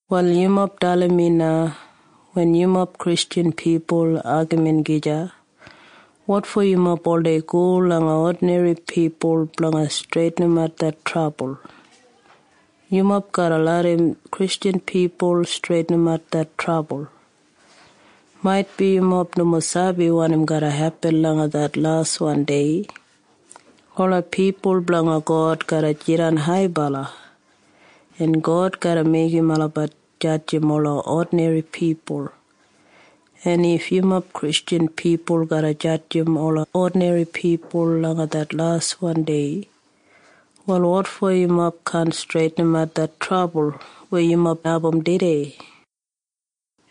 Wal yumob dalim mi na. Wen yumob Kristjan pipul agamin gija, wotfo yumob oldei go langa odinri pipul blanga streitinimat det trabul? Yumob garra larram Kristjan pipul streitinimat det trabul. Maitbi yumob nomo sabi wanim garra hepin langa det laswan dei. Ola pipul blanga God garra jidan haibala, en God garra meigim olabat jadjim ola odinri pipul. En if yumob Kristjan pipul garra jadjim ola odinri pipul langa det laswan dei, wal wotfo yumob kaan streitinimat det trabul weya yumob abum tudei?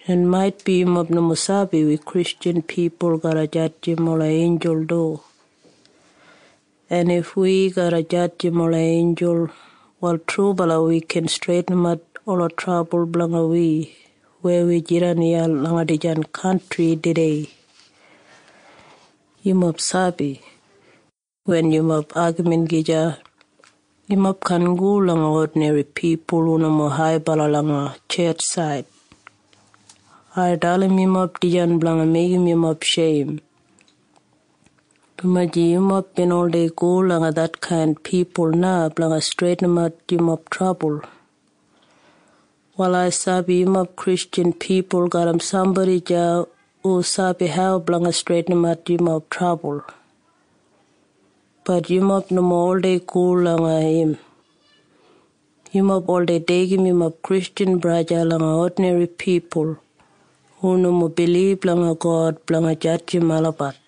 En maitbi yumob nomo sabi wi Kristjan pipul garra jadjim ola einjul du. En if wi garra jadjim ola einjul, wal trubala wi gin streitinimat ola trabul blanga wi weya wi jidan iya langa dijan kantri tudei. Yumob sabi? Wen yumob agamin gija, yumob kaan go langa odinri pipul hu nomo haibala langa tjetjsaid. Ai dalim yumob dijan blanga meigim yumob sheim, dumaji yumob bin oldei go langa detkain pipul na blanga streitinimat yumob trabul. Wal ai sabi yumob Kristjan pipul garram sambodi deya hu sabi hau blanga streitinimat yumob trabul. Bat yumob nomo oldei go langa im. Yumob oldei deigim yumob Kristjan braja langa odinri pipul hu nomo bilib langa God blanga jadjim olabat.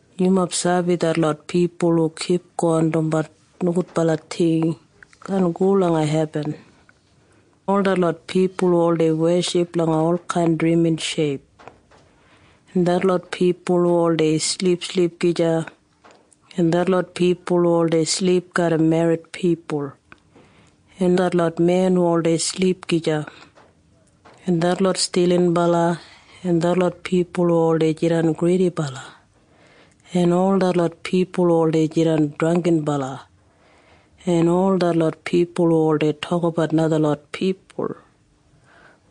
Yumob sabi detlot pipul hu kipgon dumbat nogudbala ting kaan go langa hebin. Ol detlot pipul hu oldei weship langa olkain drimin sheip, en detlot pipul hu oldei silipsilip gija, en detlot pipul hu oldei silip garram merrit pipul, en detlot men hu oldei silip gija, en detlot stilinbala, en detlot pipul hu oldei jidan gridibala, en detlot pipul hu oldei jidan drangginbala, en detlot pipul hu oldei tokabat najalot pipul,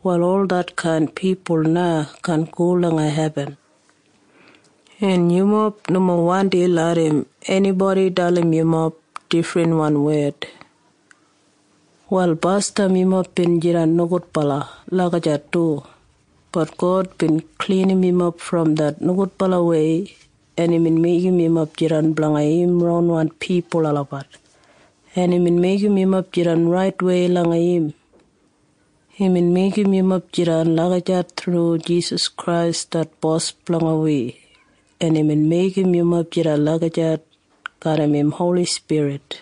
wal ol detkain pipul na kaan go langa hebin. En yumob nomo wandi larram enibodi dalim yumob difrin wed. Wal basdam yumob bin jidan nogudbala lagijat du. Bat God bin klinim yumob brom det nogudbalawei, en imbin meigim yumob jidan blanga im ronwan pipul olabat, en imbin meigim yumob jidan raitwei langa im. Imbin meigim yumob jidan lagijat thru Jisas Krais det Bos blanga wi, en imbin meigim yumob jidan lagijat garram im Holi Spirit.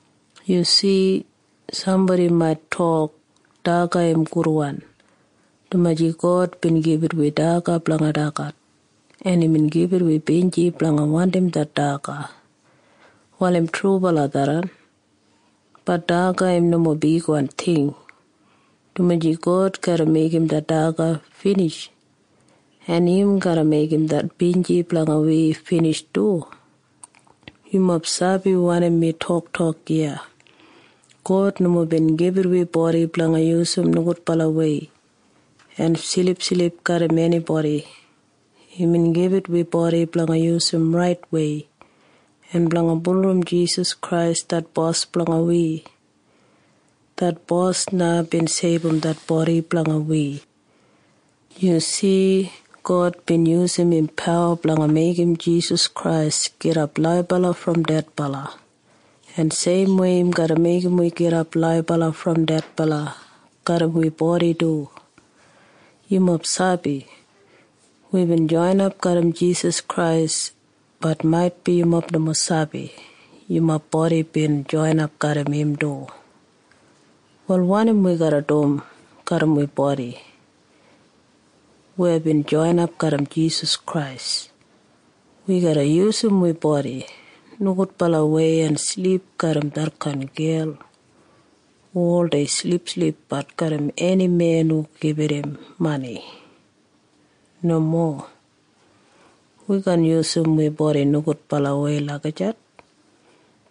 Yu si? Sambodi mait tok, “Daga im gudwan, dumaji God bin gibit wi daga blanga dagat, en imbin gibit wi binji blanga wandim det daga.” Wal im trubala tharran. Bat daga im nomo bigwan ting, dumaji God garra meigim det daga binij, en im garra meigim det binji blanga wi binij du. Yumob sabi wanim mi toktok iya? God nomo bin gibit wi bodi blanga yusum nogudbalawei en silipsilipbat garram enibodi. Imbin gibit wi bodi blanga yusum raitwei en blanga bulurrum Jisas Krais det Bos blanga wi. Det Bos na bin seibum det bodi blanga wi. Yu si? God bin yusum im pawa blanga meigim Jisas Krais gidap laibala brom dedbala. En seimwei im garra meigim wi gidap laibala brom dedbala garram wi bodi du. Yumob sabi? Wibin joinap garram Jisas Krais. Bat maitbi yumob nomo sabi yumob bodi bin joinap garram im du. Wal wanim wi garra dum garram wi bodi weya bin joinap garram Jisas Krais? Wi garra yusum wi bodi nogudbalawei en silip garram detkain gel hu oldei silipsilipbat garram eni men hu gibit im mani? Nomo. Wi kaan yusum wi bodi nogudbalawei lagijat,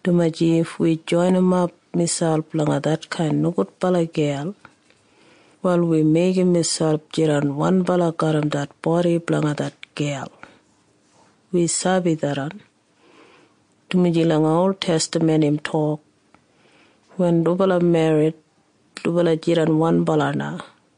dumaji if wi joinimap miselp langa detkain nogudbala gel, wal wi meigim miselp jidan wanbala garram det bodi blanga det gel. Wi sabi tharran, dumaji langa oltestaman im tok, “Wen dubala merrit, dubala jidan wanbala na.”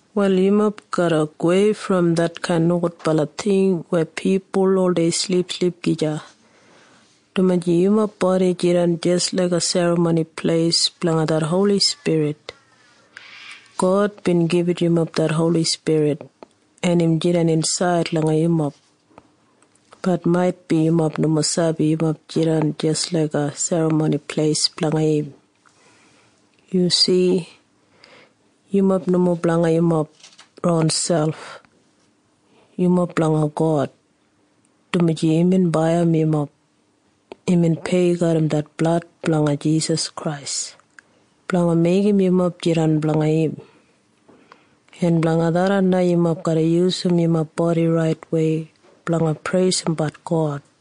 Wal yumob garra gowei brom detkain nogudbala ting weya pipul oldei silipsilip gija, dumaji yumob bodi jidan jis laiga det serramoni pleis blanga det Holi Spirit. God bin gibit yumob det Holi Spirit, en im jidan insaid langa yumob. Bat maitbi yumob nomo sabi yumob jidan jis laiga serramoni pleis blanga im. Yu si? Yumob nomo blanga yumob ronselp. Yumob blanga God, dumaji imbin baiyim yumob. Imbin pei garram det blad blanga Jisas Krais blanga meigim yumob jidan blanga im. En blanga tharran na yumob garra yusum yumob bodi raitwei blanga preisimbat God.